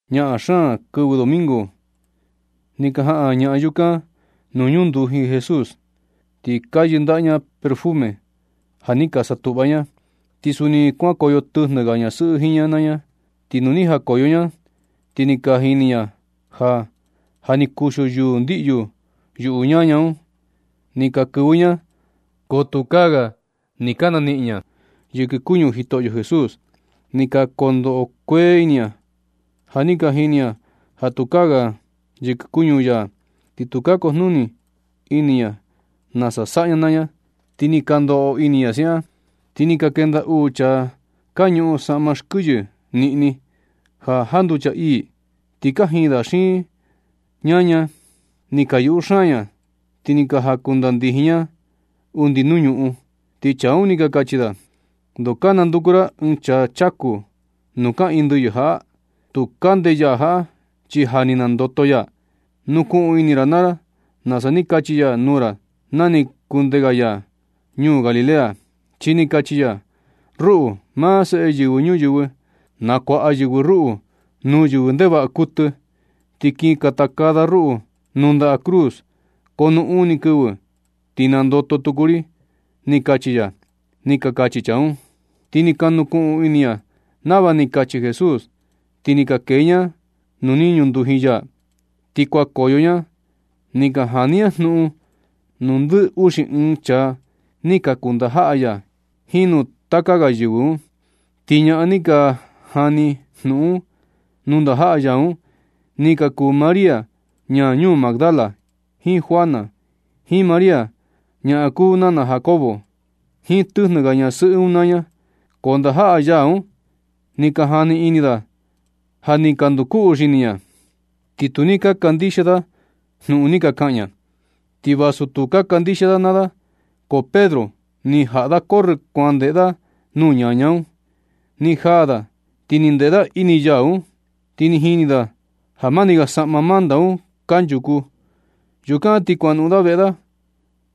Ñaꞌan xaan kɨvɨ domingo ni ka jaꞌan ñaꞌan yukan nuu ñunduji Jesús, ti ka yɨndaꞌa ña perfume ja ni ka satuꞌva ña. Ti suni kuankoyo tɨjnɨ ga ñasɨꞌɨ jiin ña naa ña. Ti nu ni jakoyo ña, ti ni ka jini ña ja, ja ni kuxio yuu ndiꞌyu yuꞌu ñaña un. Ni ka kɨvɨ ña, ko tukaa ga ni ka naniꞌin ya yɨkɨ kuñu Jitoꞌyo Jesús. Ni ka ndoꞌo kueꞌe ini ña ja ni ka jini ña ja tukaa ga yɨkɨ kuñu ya, ti tu ka kujnuni ini ña nasa saꞌa ña naa ña. Ti nɨ ka ndoꞌo ini ña siaꞌan, ti ni ka ndenda ni uu chaa ka ñuꞌun saꞌma xkɨyɨ niꞌni, ja janducha ii, ti kajiin da xiin ña naa ña. Ni ka yuꞌu xaan ña, ti ni jakundandijin nuu ña undi nuu ñuꞌun, ti chaa un ni ka kachi da: ―¿Ndoo ka nanduku ra ɨɨn chaa chaku nu kaꞌiin ndɨyɨ jaꞌa? Tu kande ya jaꞌa chi ja ni nandoto ya. Nukuꞌun ini naa ra nasa ni kachi ya nuu ra na ni kunde ga ya ñuu Galilea. Chi ni kachi ya: “Ruꞌu, maa Seꞌe Yɨvɨ Ñuyɨvɨ, nakuaꞌa yɨvɨ ruꞌu nuu yɨvɨ ndevaꞌa kuɨtɨ, ti kin katakaa da ruꞌu nuu ndaꞌa cruz, ko nu uni kɨvɨ, ti nandoto tuku ri”, ni kachi ya ―ni ka kachi chaa un. Ti ni ka nukuꞌun ini ña nava ni kachi Jesús. Ti ni ka kee ña nuu ni ñunduji ya, ti kuanukoyo ña, ni ka jani ña jnuꞌun nuu ndɨ uxi ɨɨn chaa ni ka kuu ndajaꞌa ya, jiin nuu taka ga yɨvɨ un. Ti ñaꞌan ni ka jani jnuꞌun nuu ndajaꞌa ya un, ni ka kuu María ñaa ñuu Magdala, jiin Juana, jiin María ñaꞌan kuu nana Jacobo, jiin tɨjnɨ ga ñasɨꞌɨ un naa ña. Ko ndajaꞌa ya un ni ka jani ini da ja ni ka nduloco xini ña, ti tu ni ka kandixia da jnuꞌun ni ka kaꞌan ña. Ti vasu tu ka kandixia da naa da, ko Pedro ni jaꞌa da corrɨ kuan ndeꞌe da nuu ñaña un. Ni jaa da ti ni ndeꞌe da ini yau un, ti ni jini da ja mani ga saꞌma manta un kanchuku. Yukan ti kuanoꞌon da veꞌe da,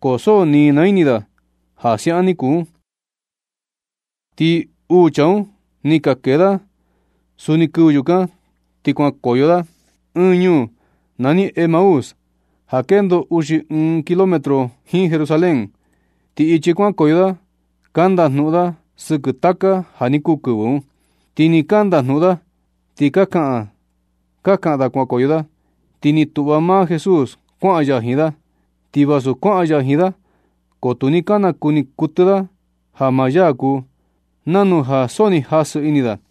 ko so ni naa ini da ja siaꞌan ni kuu un. Ti uu chaa un ni ka kee da suni kɨvɨ yukan, ti kuankoyo da ɨɨn ñuu nani Emaús ja kendo uxi ɨɨn kilometro jiin Jerusalén. Ti ichi kuankoyo da, ka ndajnuꞌun da sɨkɨ taka ja ni kuu kɨvɨ un. Ti nɨ ka ndajnuꞌun da, ti ka kaꞌan ka kaꞌan da kuankoyo da, ti ni tuꞌva maa Jesús kuaꞌan ya jiin da. Ti vasu kuaꞌan ya jiin da, ko tu ni ka nakuni kuɨtɨ da ja maa ya kuu, nanu ja so ni jasɨ ini da.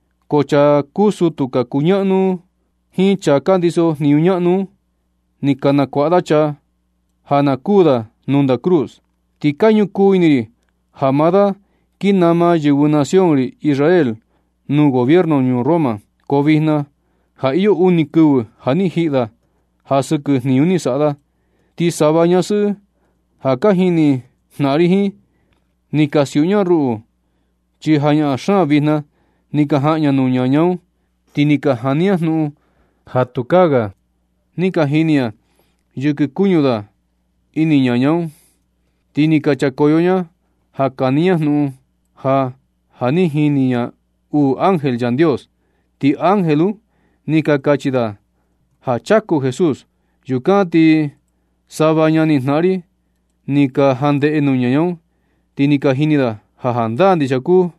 Ko chaa ka kuu sutu ka kuñaꞌnu un jiin chaa ka ndiso jniñu ñaꞌnu un, ni ka nakuaꞌa da chaa ja na kuu da nuu nda cruz. Ti ka ñukuu ini ri ja maa da kin nama yɨvɨ nación ri Israel nuu gobierno ñuu Roma. Ko vijna ja iyo uni kɨvɨ ja ni jiꞌi da ja sɨkɨ jniñu ni saꞌa da. Ti sava ñasɨꞌɨ ka jini jnaꞌan ri jiin, ni ka siuꞌu ña ruꞌu, chi jañaꞌan xaan vijna ni ka jaꞌan ña nuu ñaña un. Ti ka jani ña jnuꞌun ja tukaa ga ni ka jini ña yɨkɨ kuñu da ini ñaña un. Ti ni ka nchakoyo ña ka jani ña jnuꞌun ja, ja ni ka jini ña uu ángel Yandios. Ti ángel un ni ka kachi da ja chaku Jesús. Yukan ti sava ñanijnaꞌan ri ni ka jandeꞌe nuu ñaña un, ti ni ka jini da ja jandaa ndixia kuu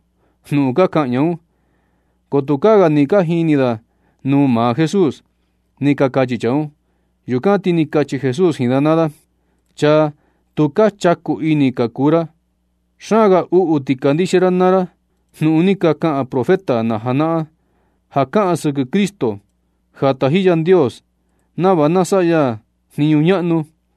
jnuꞌun ka kaꞌan ñaꞌan un, ko tukaa ga ni ka jini da nuu maa Jesús ―ni ka kachi chaa un. Yukan ti ni kachi Jesús jiin da naa da: ―¡Chaa tu ka chaku ini ka kuu ra! Xaan ga uꞌu ti kandixia ra naa ra jnuꞌun ni ka kaꞌan profeta na janaꞌan, ja kaꞌan sɨkɨ Cristo, ja taji Yandios nava na saꞌa ya jniñu ñaꞌnu.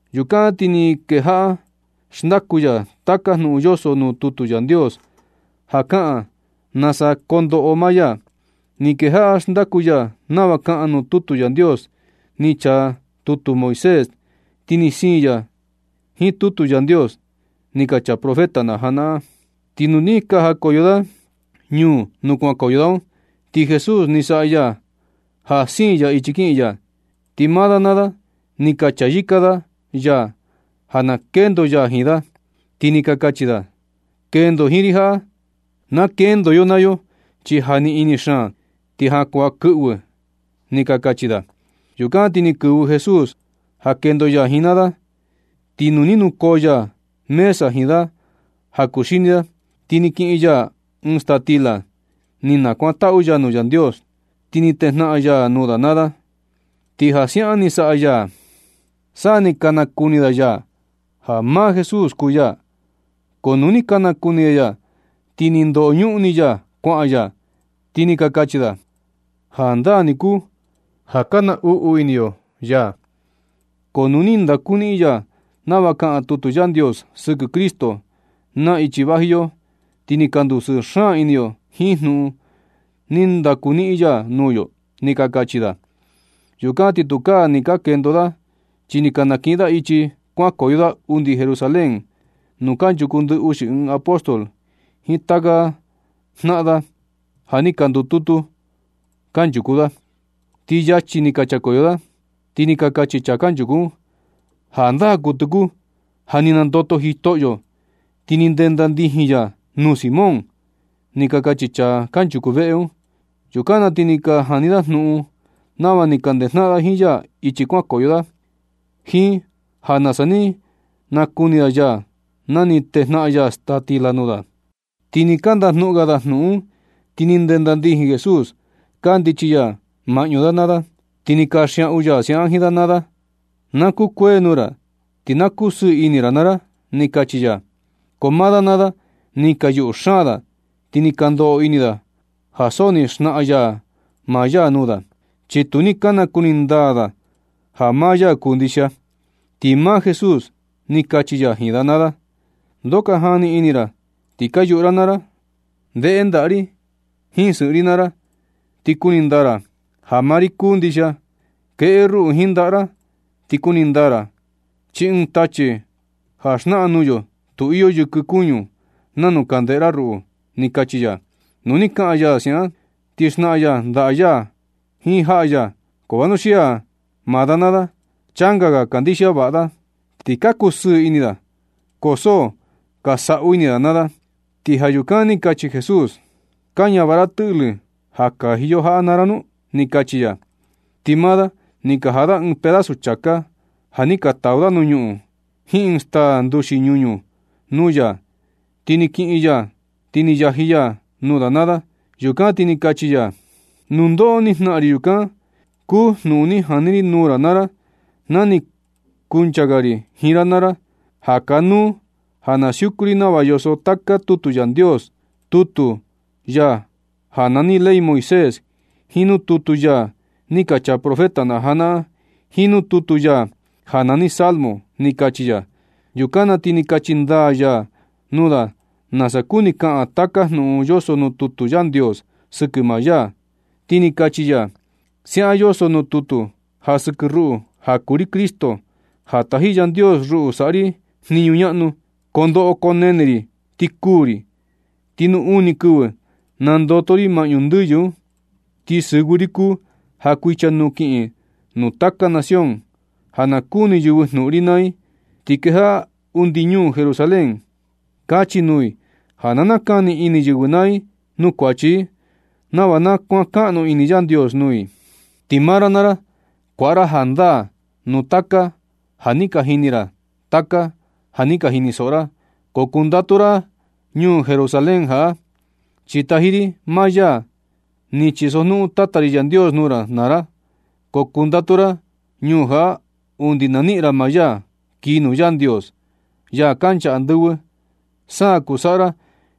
Yukan na ti ni kejaꞌa xndaku ya taka jnuꞌun yoso nuu tutu Yandios, ja kaꞌan nasa kondoꞌo maa ya. Ni kejaꞌa xndaku ya nava kaꞌan nuu tutu Yandios ni chaa tutu Moisés, ti ni siin ya jiin tutu Yandios ni ka chaa profeta na janaꞌan un. Ti nu ni ka jakoyo da ñuu nuu kuankoyo da un, ti Jesús ni saꞌa ya ja siin ya ichi kiꞌin ya. Ti maa da naa da ni ka chayɨka da ya ja na kendo ya jiin da, ti ni ka kachi da: ―Kendo jiin ri jaꞌa na kendo yo naa yo, chi ja ni ini xaan, ti ja kuan kɨꞌvɨ ―ni ka kachi da. Yukan ti ni kɨvɨ Jesús ja kendo ya ni naa da. Ti nu ni nukoo ya mesa jiin da ja kuxini da, ti ni kiꞌin ya ɨɨn staa stila, ni nakuantaꞌu ya nuu Yandios, ti ni tejnaꞌan ya nuu da naa da. Ti ja siaꞌan ni saꞌa ya, sa ni ka nakuni da ya, ja maa Jesús kuu ya. Ko nu ni ka nakuni da ya, ti ni ndoñuꞌun ni ya kuaꞌan ya. Ti ni ka kachi da: ―Jandaa ni kuu ja ka naꞌnu ini yo ya, ko nu ni ndakuniꞌin ya nava kaꞌan tutu Yandios sɨkɨ Cristo, na ichi vaji yo, ti ni ka ndusɨɨ xaan ini yo jiin jnuꞌun ni ndaku niꞌin ya nuu yo ―ni ka kachi da. Yukan ti tukaa ni ka kendo da, chi ni ka nakiꞌin da ichi kuanukoyo da undi Jerusalén nuu kanchuku ndɨ uxi ɨɨn apóstol jiin taka ga jnaꞌan da, ja ni ka ndututu da kanchuku da. Ti yachi ni ka nchakoyo da, ti ni ka kachi chaa kanchuku un: ―¡Jandaa kuɨtɨ kuu ja ni nandoto Jitoꞌyo, ti ni ndenda ndijin ya nuu Simón! ―ni ka kachi chaa kanchuku veꞌe un. Yukan na ti ni ka jani da jnuꞌun nava ni ka ndejnaꞌan da jiin ya ichi kuankoyo da, jiin ja nasa ni ka nakuni da ya na ni tejnaꞌan ya staa stila nuu da. Ti ni ka ndajnuꞌun ga da jnuꞌun un, ti ni ndenda ndijin Jesús kandichi ya maꞌñu da naa da, ti ni kanxiaꞌu ya siaꞌan jiin da naa da: ―Na kukuee nuu ra, ti na kusɨɨ ini ra naa ra ―ni kachi ya. Ko maa da naa da ni ka yuꞌu xaan da, ti ka ndoꞌo ini da ja so ni naxnaꞌan ya maa ya nuu da, chi tu ni ka nakuni ndaa da ja maa ya kuu ndixia. Ti maa Jesús ni kachi ya jiin da naa da: ―¿Ndoo ka jani sɨkɨ ini ra ti ka yuꞌu ra naa ra? Ndeꞌe ndaꞌa ri jiin sɨꞌɨn ri naa ra, ti kuni ndaa ra ja maa ri kuu ndixia. Keꞌe ruꞌu jiin ndaꞌa ra ti kuni ndaa ra, chi ɨɨn tachi ja naxnaꞌan nuu yo tu iyo yɨkɨ kuñu nanu ka ndeꞌe ra ruꞌu ―ni kachi ya. Nu ni kaꞌan ya siaꞌan, ni xnaꞌan ya ndaꞌa ya jiin jaꞌa ya. Ko vanuxia maa da naa da, changa ga kandixia vaꞌa da, ti ka kusɨɨ ini da, ko so ka saꞌu ini da naa da. Ti ja yukan ni kachi Jesús: ―¿Ka ñavaꞌa ra tɨꞌlɨ ja kaji yo jaꞌa naa ra nu? ―ni kachi ya. Ti maa da ni ka jaꞌa da ɨɨn pedazu chāká ja ni ka tau da nuu ñuꞌun, jiin ɨɨn staa nduxi ñuñu nuu ya. Ti ni kiꞌin ya un, ti ni yaji ya nuu da naa da. Yukan ti ni kachi ya: ―Nundoꞌo ni jnaꞌan ri, yukan kuu jnuꞌun ni jani ri nuu ra naa ra na ni kuncha ga ri jiin ra naa ra, ja kanuu ja na siuku ri nava yoso taka tutu Yandios, tutu ya ja nani ley Moisés, jiin nuu tutu ya ni ka chaa profeta na janaꞌan, jiin nuu tutu ya ja nani Salmo ―ni kachi ya. Yukan na ti ni kachi ndaa ya nuu da nasa kuni kaꞌan taka jnuꞌun yoso nuu tutu Yandios sɨkɨ maa ya. Ti ni kachi ya: ―Siaꞌan yoso nuu tutu ja sɨkɨ ruꞌu ja kuu ri Cristo, ja taji Yandios ruꞌu saꞌa ri jniñu ñaꞌnu, koo ndoꞌo koo nene ri ti kuū ri. Ti nu uni kɨvɨ ti nandoto ri maꞌñu ndɨyɨ un. Ti sɨvɨ ri kuu ja kuichanuu kiꞌin nuu taka nación, ja na kuni yɨvɨ jnuꞌun ri naa i. Ti kejaꞌa undi ñuu Jerusalén, kachi nuu i ja na nakani ini yɨvɨ naa i nuu kuachi i, nava na kuankaꞌnu ini Yandios nuu i. Ti maa ra naa ra, kuaꞌa ra jandaa nuu taka ja ka jini ra jiin taka ja ni ka jinisoꞌo ra. Ko kundatu ra ñuu Jerusalén jaꞌa, chi taji ri maa ya ni chisojnuꞌun Tata ri Yandios nuu ra naa ra. Ko kundatu ra ñuu jaꞌa undi na niꞌin ra maa ya kii nuu Yandios, ya kancha andɨvɨ, sa kuu saꞌa ra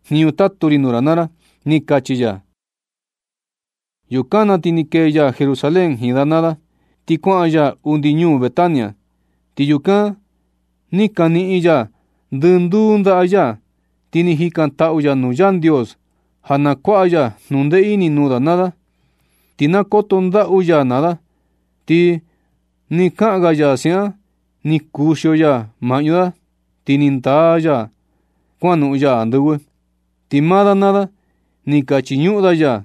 jniñu tatu ri nuu ra naa ra ―ni kachi ya. Yukan na ti ni kee ya Jerusalén jiin da naa da, ti kuaꞌan ya undi ñuu Betania. Ti yukan ni kaniꞌin ya ndɨnduu ndaꞌa ya, ti ni jikantaꞌu ya nuu Yandios ja na kuaꞌa ya jnundee ini nuu da naa da, ti na koto ndaꞌu ya naa da. Ti nɨ kaꞌan ga ya siaꞌan, ni kuxio ya maꞌñu da ti ni ndaa ya kuanoꞌon ya andɨvɨ. Ti maa da naa da ni ka chiñuꞌun da ya,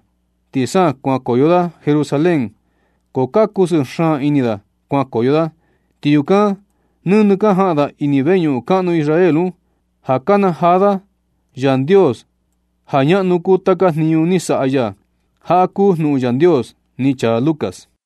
ti sa kuan nukoyo da Jerusalén, ko ka kusɨɨ xaan ini da kuankoyo da. Ti yukan nɨnɨ ka jaꞌan da ini veñuꞌun kaꞌnu Israel un, ja ka nakanajaa da Yandios ja ñaꞌnu kuu taka jniñu ni saꞌa ya. Jaꞌa kuu jnuꞌun Yandios ni chaa Lucas.